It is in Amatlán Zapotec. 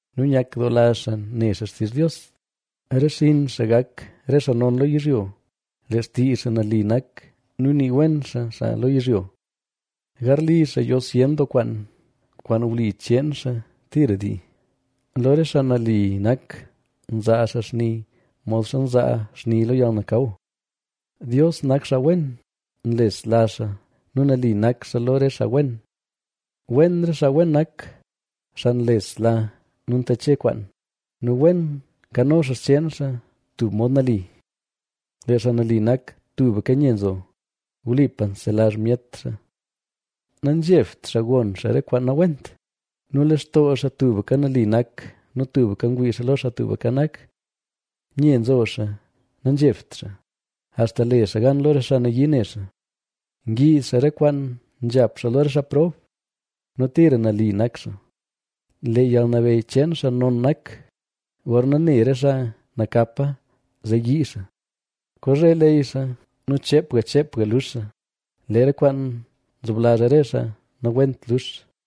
nu nyakdoola xaa ne xaa xtizh Dios. Re xinn xaa gak re xaa non lo yizhyo; lee xtii xaa nali nak nu nii wen xaa xaa lo yizhyo. Garli xaa yo zyen doo kwaan, kwaan wli cheen xaa tira dii. Lo re xaa nali nak nzaa xaa xni modxa nzaa xni lo yalnakaw. Dios nak xaa wen, nlesla xaa nu nali nak xaa lo re xaa wen. Wen re xaa wen nak, xaa nlesla nu ntache kwaan nu wen nkano xaa xcheen xaa tub mod nali. Lee xaa nali nak tubka nye nzo; wlipa nselazh myet xaa. Nazhebt xaa gon xaa re kwaan nawent; nu lextoo xaa tubka nali nak nu tubka ngwii xaa lo Xaa Tubka Nak. Nye nzo xaa, nanzhebt xaa, axta le xaa gan lo re xaa nayii ne xaa. Ngiiz xaa re kwaan nzhap xaa lo re xaa prob; nu tira nali nak xaa; lee yalnabeyy cheen xaa non nak. Gorna ne re xaa nakapa zee yii xaa; kozhe leyy xaa nu cheepga cheepga lux xaa. Lee re kwaan nzoblazh re xaa nawent lux.